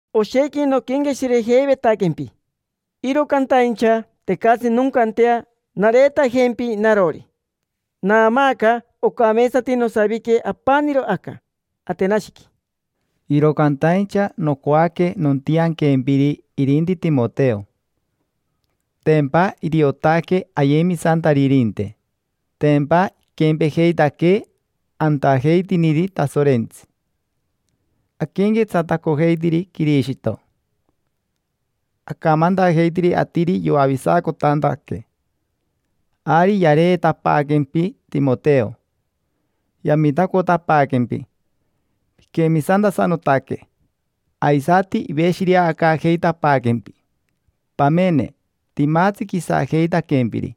Oshequi noquenqueshirejeivetaquempi, iro cantaincha tecatsi noncantea nareetajempi narori. Naamaaca ocameetsati nosavique apaniro aca Atenashiqui, iro cantaincha nocoaque notianquempiri irinti Timoteo. Tempa iriotaque ayemisantaririnte, tempa iquempejeitaquee antajeitiniri Tasorentsi, aquenquetsatacojeitiri Quirishito, acamantajeitiri atiri yoavisacotantaque. Ari yareetapaaquempi Timoteo, yamitacotapaaquempi piquemisantasanotaque, aisati iveshireacaajeitapaaquempi. Pamene, timatsi quisajeitaquempiri,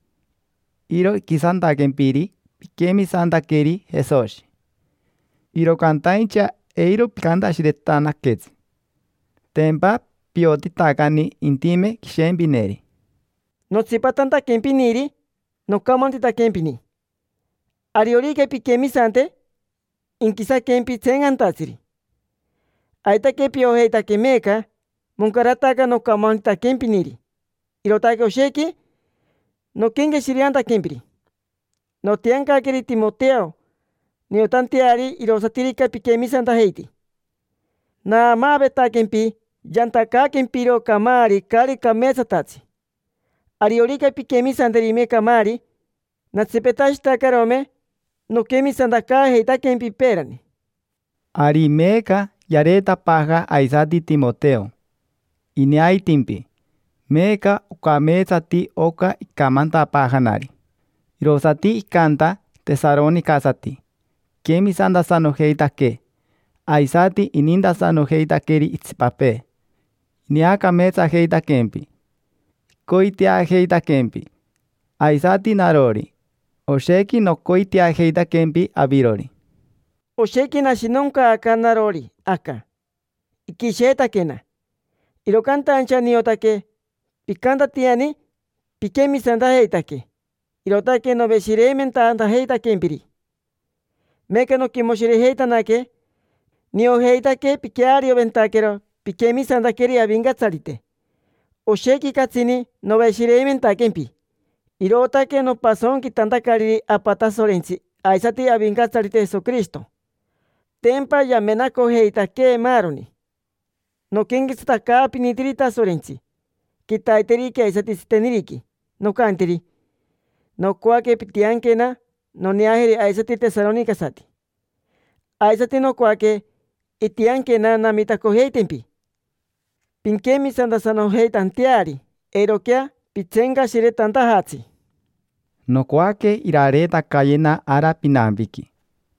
iro iquisantaquempiri piquemisantaqueri Jesoshi. Iro cantaincha eiro picantashiretanaquetsi, tempa piotitacani intime quishempineri. Notsipatantaquempiniri, nocamantitaquempini: “Ariorica pinquemisante, inquisaquempi tseencantatsiri”. Aitaque piojeitaque meeca moncarataca nocamantitaquempiniri, irootaque oshequi noquenqueshireantaquempiri. Notiancaqueri Timoteo niotanteari irosatirica piquemisantajeiti. Naamaavetaquempi yantacaaquempiro camaari caari cameetsatatsi. Ariorica pinquemisanterime camaari, natsipetashitacarome noquemisantacaajeitaquempi peerani. Ari meeca yareetapaaja aisati Timoteo. Ineaitimpi, meeca ocameetsati oca icamantapaajanari: “Irosati icanta tesaronicasati, iquemisantasanojeitaque, aisati inintasanojeitaqueri itsipapee. Ineacameetsajeitaquempi, icoiteajeitaquempi”. Aisati narori, oshequi nocoiteajeitaquempi avirori. Oshequi nashinoncaaca narori aca, iquisheetaquena. Iro cantaincha niotaque picantatiani piquemisantajeitaque, irootaque noveshireimentantajeitaquempiri. Meeca noquimoshirejeitanaque, niojeitaque piquearioventaquero piquemisantaqueri Avincatsarite. Oshequi catsini noveshireimentaquempi, irootaque nopasonquitantacariri Apa Tasorentsi aisati Avincatsarite Jesoquirishito. Tempa yamenacojeitaquee maaroni. Noquenquetsatacaapinitiri Tasorentsi: quitaiteriqui aisati tsiteniriqui. Nocantiri: “Nocoaque pintianquena noneajeri aisati tesaronicasati”. Aisati nocoaque intianquena namitacojeitempi pinquemisantasanojeitanteari eiroquea pitseencashiretantajatsi. Nocoaque irareetacayena ara pinampiqui.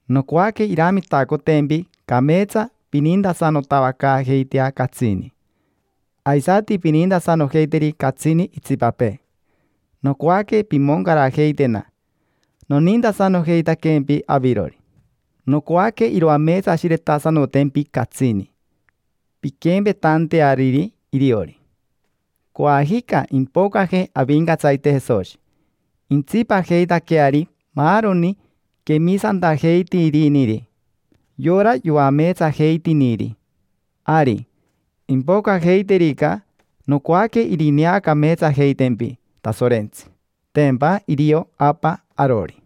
Nocoaque iramitacotempi cameetsa pinintasanotavacaajeitea catsini, aisati pinintasanojeiteri catsini itsipapee. Nocoaque pimoncarajeitena, nonintasanojeitaquempi avirori. Nocoaque iroameetsashiretasanotempi catsini, pinquempetanteariri iriori. Coajica impocaje Avincatsarite Jesoshi, intsipajeitaqueari maaroni quemisantajeitiriniri, yora yoameetsajeitiniri. Ari, impocajeiterica, nocoaque irineacameetsajeitempi Tasorentsi: tempa irio Apa arori.